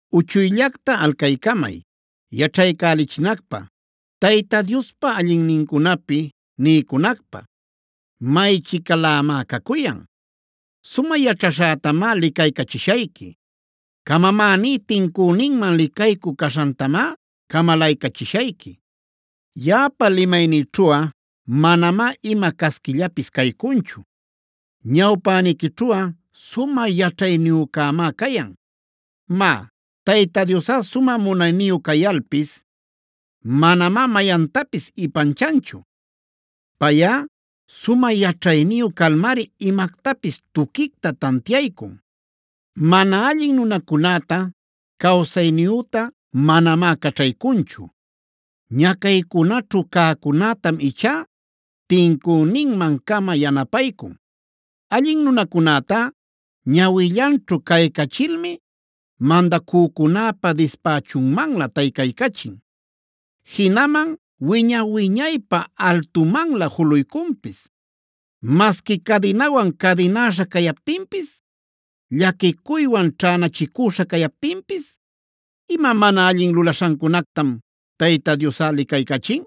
“Uchuyllacta alcaycamay, yaćhaycälichinacpä; Tayta Diospa allinnincunapi niycunacpä maychicalämá cacuyan. Sumä yaćhaśhätamá licaycachishayqui; camamäní tincüninman licaycü caśhantamá camalaycachishayqui. Yaꞌapa limaynïćhuꞌa manamá ima casquillapis caycunchu; ñawpäniquićhuꞌa sumä yaćhayniyücämá cayan. “Má, Tayta Diosꞌa sumä munayniyu cayalpis manamá mayantapis ipanchanchu. Payꞌa sumä yaćhayniyu calmari imactapis tuquicta tantiaycun. Mana allin nunacunäta cawsayniyüta manamá caćhaycunchu; ñacaycunaćhu cäcunätam ichá tincüninman-cama yanapaycun. Allin nunacunätá ñawillanćhu caycachilmi, mandacücunäpa dispächunmanlä taycaycachin, jinaman wiña-wiñaypä altumanlä juluycunpis. “Masqui cadinawan cadinäśha cayaptinpis, llaquicuywan ćhänachicüśha cayaptinpis, ima mana allin lulaśhancunactam Tayta Diosꞌa licaycachin.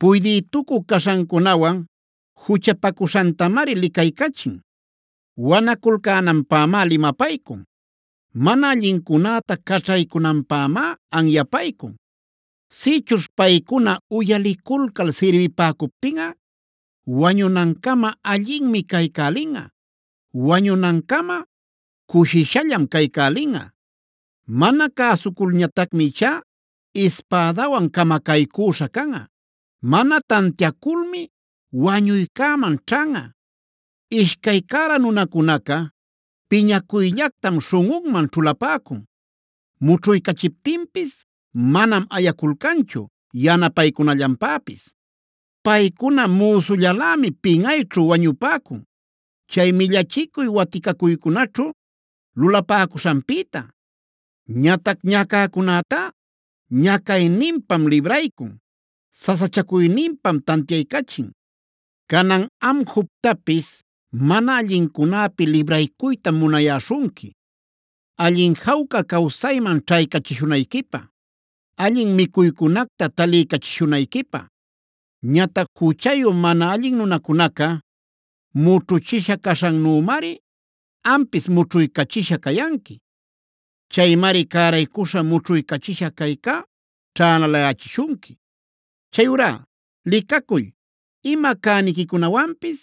Puydïtucü caśhancunawan juchapacuśhantamari licaycachin. Wanaculcänanpämá limapaycun; mana allincunäta caćhaycunanpämá anyapaycun. Sïchuśh paycuna uyaliculcal sirbipäcuptinꞌa, wañunancama allinmi caycälinꞌa; wañunancama cushishallam caycälinꞌa. Mana cäsuculñatacmi ichá ispädawan camacaycüśha canꞌa; mana tantiaculmi wañuycäman ćhanꞌa. “Ishcay cära nunacunaca piñacuyllactam śhunꞌunman ćhulapäcun. Mućhuycachiptinpis manam ayaculcanchu yanapaycunallanpäpis. Paycuna müsullalämi pinꞌayćhu wañupäcun, chay millachicuy waticacuycunaćhu lulapäcuśhanpïta. Ñatac ñacäcunätá ñacayninpam libraycun; sasachacuyninpam tantiaycachin. “Canan am Jobtapis mana allincunäpi libraycuytam munayüśhunqui, allin jawca cawsayman ćhaycachishunayquipä, allin micuycunacta taliycachishunayquipä. Ñatac juchayu mana allin nunacunaca mućhuchisha caśhannümari ampis mućhuycachisha cayanqui. Chaymari cäraycuśha mućhuycachisha cayca ćhänalayächishunqui. Chayurá licacuy, ima cäniquicunawanpis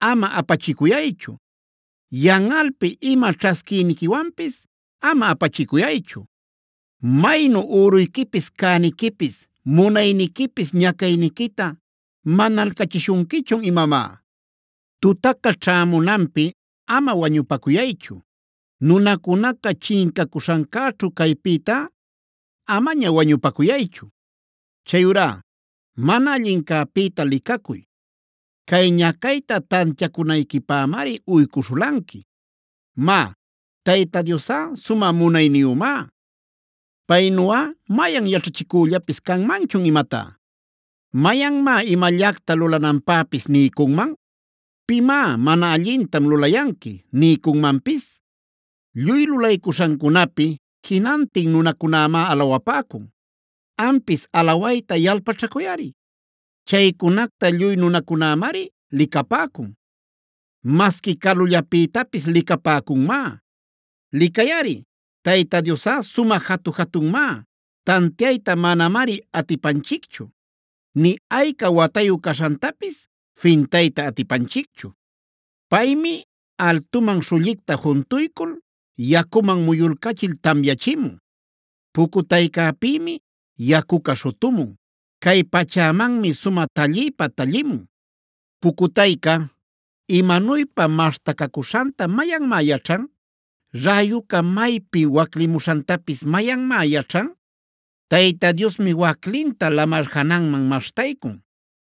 ama apachicuyaychu; yanꞌalpi ima ćhasquiyniquiwanpis ama apachicuyaychu. ¿Maynu üruyquipis, cäniquipis, munayniquipis ñacayniquita manalcachishunquichun imamá? Tutaca ćhämunanpi ama wañupacuyaychu; nunacunaca chincacuśhancäćhu caypïta amaña wañupacuyaychu. Chayurá mana allincäpïta licacuy. Cay ñacayta tantiacunayquipämari uycuśhulanqui. “Má, Tayta Diosꞌa sumä munayniyümá. ¿Paynuꞌa mayan yaćhachicüllapis canmanchun imatá? ¿Mayanmá imallacta lulananpäpis niycunman? ¿Pimá ‘mana allintam’ lulayanqui niycunmanpis? Lluy lulaycuśhancunapi jinantin nunacunämá alawapäcun; ampis alawayta yalpaćhacuyꞌari. Chaycunacta lluy nunacunämari licapäcun; masqui calullapïtapis licapäcunmá. “Licayꞌari, Tayta Diosꞌa sumä jatu-jatunmá; tantiayta manamari atipanchicchu, nï ayca watayu caśhantapis fintayta atipanchicchu. Paymi altuman śhullicta juntuycul, yacuman muyulcachil tamyachimun. Pucutaycäpïmi yacuca śhutumun; cay pachämanmi sumä talliypa tallimun. ¿Pucutayca imanuypa maśhtacacuśhanta mayanmá yaćhan? ¿Räyuca maypi waclimuśhantapis mayanmá yaćhan? Tayta Diosmi waclinta lamar jananman maśhtaycun;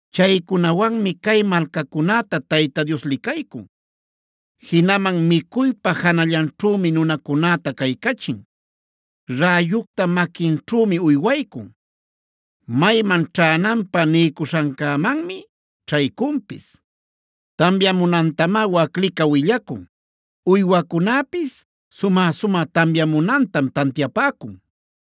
Chaycunawanmi cay malcacunäta Tayta Dios licaycun; jinaman micuypa janallanćhümi nunacunäta caycachin. Räyucta maquinćhümi uywaycun; mayman ćhänanpä niycuśhancämanmi ćhaycunpis. Tamyamunantamá waclica willacun; uywacunäpis sumä-sumä tamyamunantam tantiapäcun.